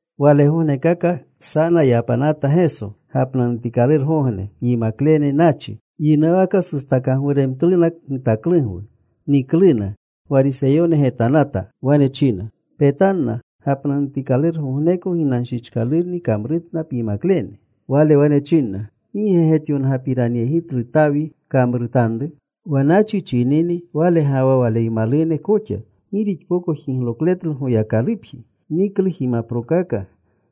Walegognekaka sana yapanata Geso gapnanutikalurugogne. Yimaklene nachi. Yinuwaka sustakagwuremtluna gitaklugwu. Nikluna. Gwariseyone getanata. Wane chinruna, “Petanna. Gapnanutikalurugogneko ginanshichkalurni kamrutna pyimaklene.” Wale wane chinna, “¿Gi ge getyongapiranyegitlu Tawi kamrutanru? Wa nachichini wale ga wa waleymalune koxa. Gi rixpoko jiglokletlu Goyakalupji. Niklu jimaprokaka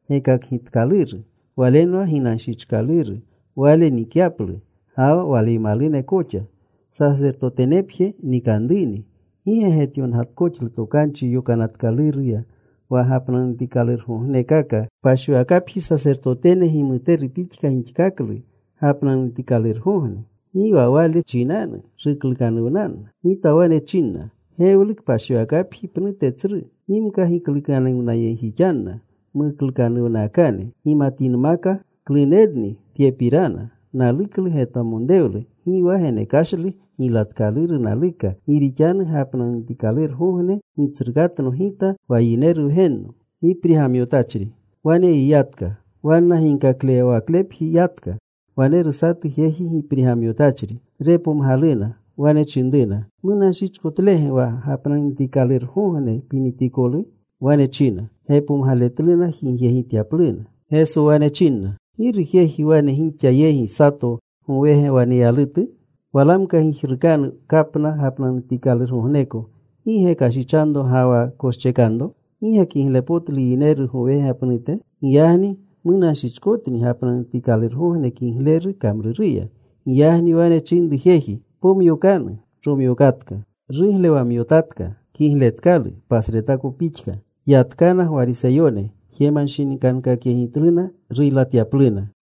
gekakgitkaluru. Walenwa ginanshichkaluru wale nikyaplu, ga wa waleymalune koxa. Sasertotenepje nikanruni. ¿Gi ge getyongatkoxlu Tokanchi Yokanatkaluruya wa gapnanutikalurgognekaka kpashiwakapji, sasertotene gimuteru pixka gixkaklu gapnanutikalurgogne? Gi wale chinanu ruklukanuwnanna. Gita wane china, gewlu kpashiwakapji pnute tsru. Gimka giklukanuwnayegjixanna muklukanuwnakane, gimatinmaka klunerni tyepirana: Naluklu getwamonrewlu. Gi wa genekashlu giylatkaluru naluka. Gi rixanu gapnanutikalurugogne Gitsrukatno Gita wa Yineru Wgenno.” Wane yiyatka. Wanna ginkaklewawaklepji yatka. Waneru satu jeji giprigamyotachri. Repomgaluna. Wane chinruna, “¿Munanshichkotlege wa gapnanutikalurugogne pinitikolu?” Wane chinna gepomgaletluna jigyegityapluna. Geso wane chinna, “¿Giru jeji wane gixa yegi, sato gowega waneyalutu? Walamka gijrukanu kapna gapnanutikalurgogneko. ¿Gi ge kashichanro ga wa koschekanro? ¿Gi ge kiglepotlu yineru gowega pnute? Giyagni munanschichkotni gapnanutikalurugogne kigleru kamruruya.” Giyagni wane chinru jeji, “Pomyokanu.” Romyokatka. Ruglewamyotatka. Kigletkalu pasretako pixka. Yatkana Gwariseyone. Jemanshinikankakyegitluna ruylatyapluna.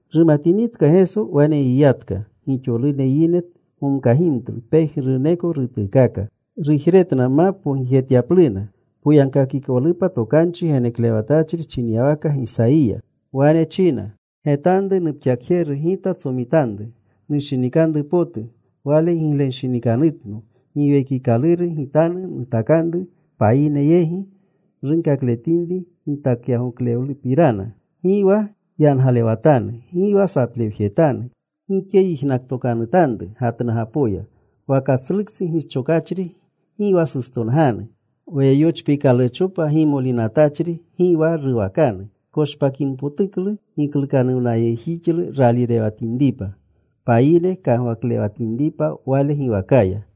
Rumatinitka Geso, wane yiyatka. Gixolune yine gomkagimtlu. Pejnuruneko rutuukaka. Rujretna ma pogijetyapluna, poyagkakikolupa tokanchi geneklewatachri chinyawaka Gisayiya. Wane china: Getanru nupxakjeru Gita tsomitanru. Nushinikanru potu. Wale gigletanshinikanutno. Giwekikaluru Gitanu nutakanru payine yegi runkakletinri gitakyagoklewlupirana. Gi wa yangalewatanu. Gi wa saplewjetanu. Gike yijnaktokanutanru gatnugapoya. Wa katsluksu gischokachri gi wa sustonganu. Wa yochpiikalurchopa gimoliinatachri gi wa ruwakanu, koshpakinpotuklu giklukanuwnayegjixlu raalirewatinripa, payine kagwaklewatinripa Wale giwakaya.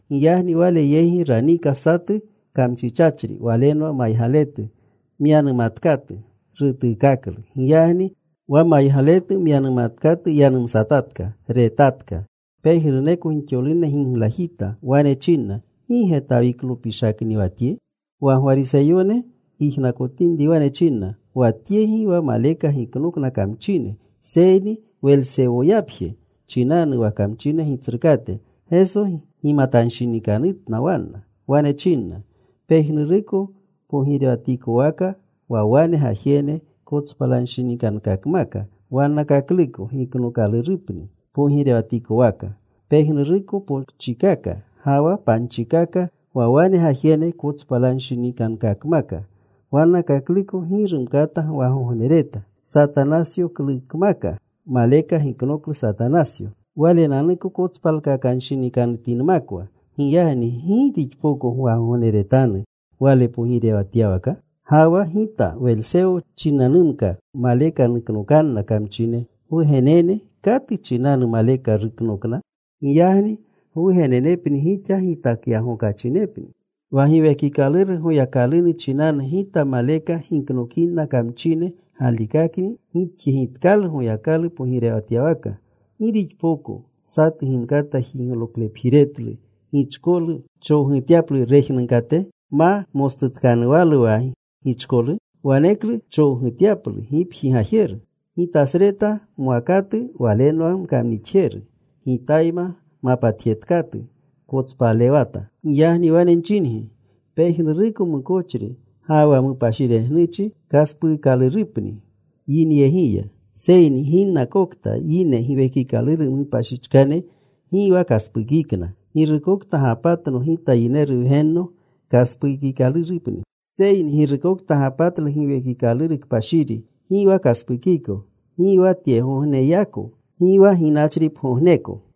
Giyagni Wale yegi raniika satu kamchichachri. Walenwa maygaletu, myanumatkatu. Rutuukaklu. Giyagni wa maygaletu myanumatkatu yanumsatatka, retatka. Pejnuruneko gixolune giglajita. Wane chinna, “¿Gi ge Tawiklopishakni wa Tye?” Wa Gwariseyone yijnakotinri, wane chinna, “Wa Tye gi wa maleka giknokna kamchine, seyni Welsewoyapje chinanu, wa kamchine gitsrukate.” Geso gimatanshinikanutanna wanna. Wane chinna, “Pejnuruko pogirewatikowaka wa wane gajene kotspalanshinikankakmaka wannakakluko, giknookalurupni pogirewatikowaka. Pejnuruko pokchikaka ga wa panchikaka wa wane gajene kotspalanshinikankakmaka wannakakluko, gi rumkata gwagognereta. Satanasyokaklukmaka maleka giknoklu Satanasyo, walenanuko kotspalkakanshinikanutinmakwa. Giyagni ¿gi rixpoko gwagogneretanu wale pogirewatyawaka? Ga wa Gita Welsewo chinanumka maleka nuknokanna kamchine, gwugenene ¿katu chinanu maleka ruknokna? Giyagni gwugenenepni gixa gitakyagokachinepni. Wa Giwekikaluru Goyakalunu chinanu Gita maleka giknokinna kamchine, galikakni gixyegitkalu Goyakalu pogirewatyawaka. “¿Gi rixpoko satu gimkata jiglokapjiretlu gichkolu, chowgutyaplu rejnunkate, ma mostutkanuwalu wa gichkolu? Waneklu chowgutyalu gipji gajeru. “Gitasreta mwakatu, walenwa nkamnixjeru. Gitayma mapatjetkatu, kotspalewata. Giyagni wane nchingi, pejnuruko mukochri ga wa mupashiregnuchi kaspuukalurupni yinyegiya. Seyni ginnakokta yine Giwekikaluru mupashichkane, gi wa kaspukikna. Girukokta gapatno Gita Yineru Wgenno kaspukikalurupni. Seyni girukokta gapatlu Giwekikaluru Kpashiri gi wa kaspukiko, gi wa tyegogneyako, gi wa ginachripgogneko.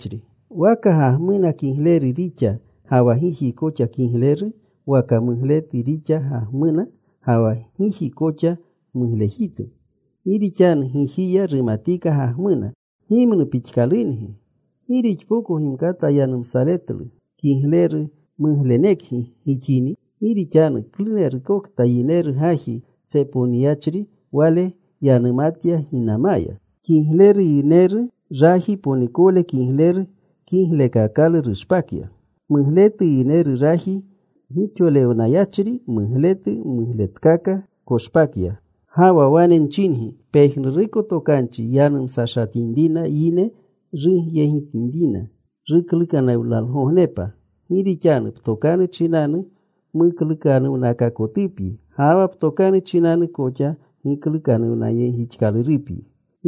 “Waka gagmuna kigleru rixa ga wa giji koxa kiglejiru, waka mugletu rixa gagmuna, ga wa giji koxa muglejitu. Gi rixanu gijiya rumatika gagmuna. Gimnu pixkalungi. ¿Gi gixpoko gimkata yanumsaletlu kigleru, muglenekgi gixini? Gi rixanu klunerutka yineru gaji tsepowniyachri, wale yanumatya ginamaya. Kigleru yineru, raji ponikowle kigleru, kiglekakalu koshpakya. Mugletu yineru raji gixolewniyachri mugletu, mugletkaka koshpakya. Ga wa wane nchingi, pejnuruko tokanchi yanumsashatinrina yine, rugyegitanruna giklukanuwnalgognepa. Gi rixanu ptokanu chinanu muklukanuwnakaakotupyi, ga wa ptokanu chinanu koxa giklukanuwnayegjixkalurupyi.”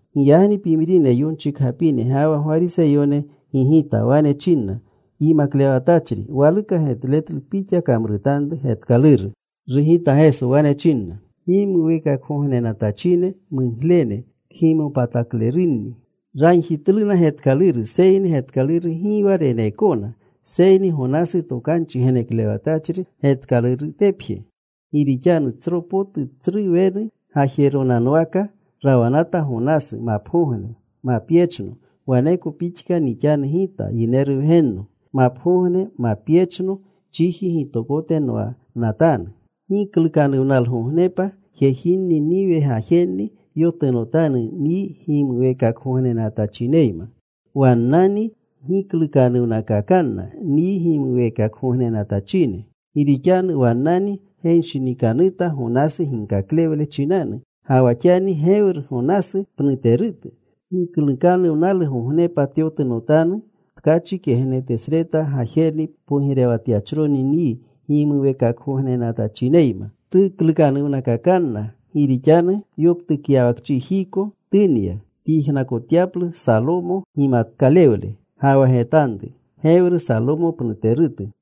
Giyagni pimrine yonchikgapine ga wa Gwariseyone gigita. Wane chinna, “Yimaklewatachri, waluka getletlu pixa kamrutanru getkaluru.” Rugita Geso. Wane chinna, “Gimuweekakgognenatachine muglene, kgimopataklerunni ragjitluna getkaluru, seyni getkaluru gi wa reneekona, seyni Gonasu tokanchi geneklewatachri getkalurutepje. Gi rixanu tsro potu tsru wenu gajeronanwaka rawanata Gonasu mapgogne, mapyechno, waneko pixka nixanu Gita Yineru Wgenno. Mapgogne, mapyechno chiji gitokote nwanatanu. Giklukanuwnalgognepa jejinni, Niniwe gajenni, yotunotanu nyi gimuweekakgognenatachineyma. Wannani giklukanuwnakakanna nyi gimuweekakgognenatachine. Gi rixanu wannani genshinikanuta Gonasu ginkaklewle chinanu. Ga wa xani gewru Gonasu pnuterutu. Giklukanuwnalgognepa tyotunotanu tkachi kegnetesreta gajerni pogirewatachroni nyi gimuweekakgognenatachineyma. Tuklukanuwnakakanna, gi rixanu yoptukyawakchijiko tunya tyijnakotyaplu Salomo gimatkalewle. Ga wa getanru. Gewru Salomo pnuterutu.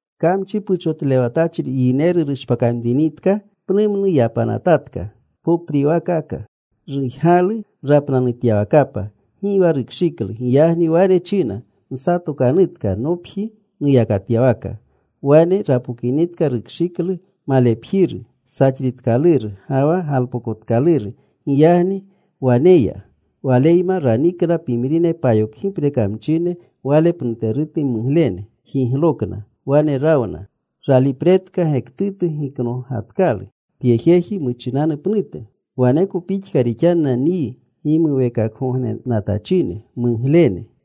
“Kamchi puchotlewatachri yineru rushpakamtinika, pnumnu yapanatatka, popriwaakaka. Rujgalu rapnanutyawakapa. Gi wa rukshiklu. Giyagni wane china, ‘Nsatokanutka nopji nuyakatyawaka.’ Wane rapokinitka rukshiklu malepjiru, saxritkaluru ga wa galpokotkaluru. Giyagni wane ya. Waleyma ranikna pimrine payokgipre kamchine wale pnuterune muglene. Jiglokna. Wane rawna. Ralipretka gektutu giknogatkalu tye jeji muchinanu pnute. Waneko pixka rixanna nyi gimuweekakgognenatachine muglene.”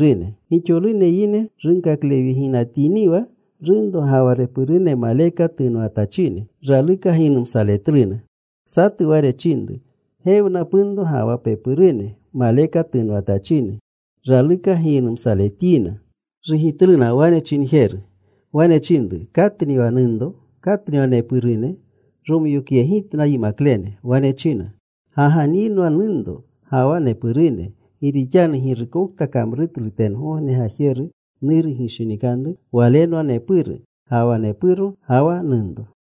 Gixolune yine runkaklewyeginatiniwa, runro ga wa repurune maleka tunwatachine, raluka giynumsaletluna. Satu wane chinru, “Gewna punro ga wa pepurune, maleka tunwatachine. Raluka giynumsaletyina.” Rugitlu wane chinjeru. Wane chinru, “¿Katni wa nunro? ¿Katni wa nepurune?” Romyokyegitna yimaklene. Wane china, “Ga ga nyinwa nunro, ga wa nepurune. Gi rixanu girukokta kamrutlu tengogne Gajeru Nuru gishinikanru, walenwa nepuru, ga wa nepuro, ga wa nunro.”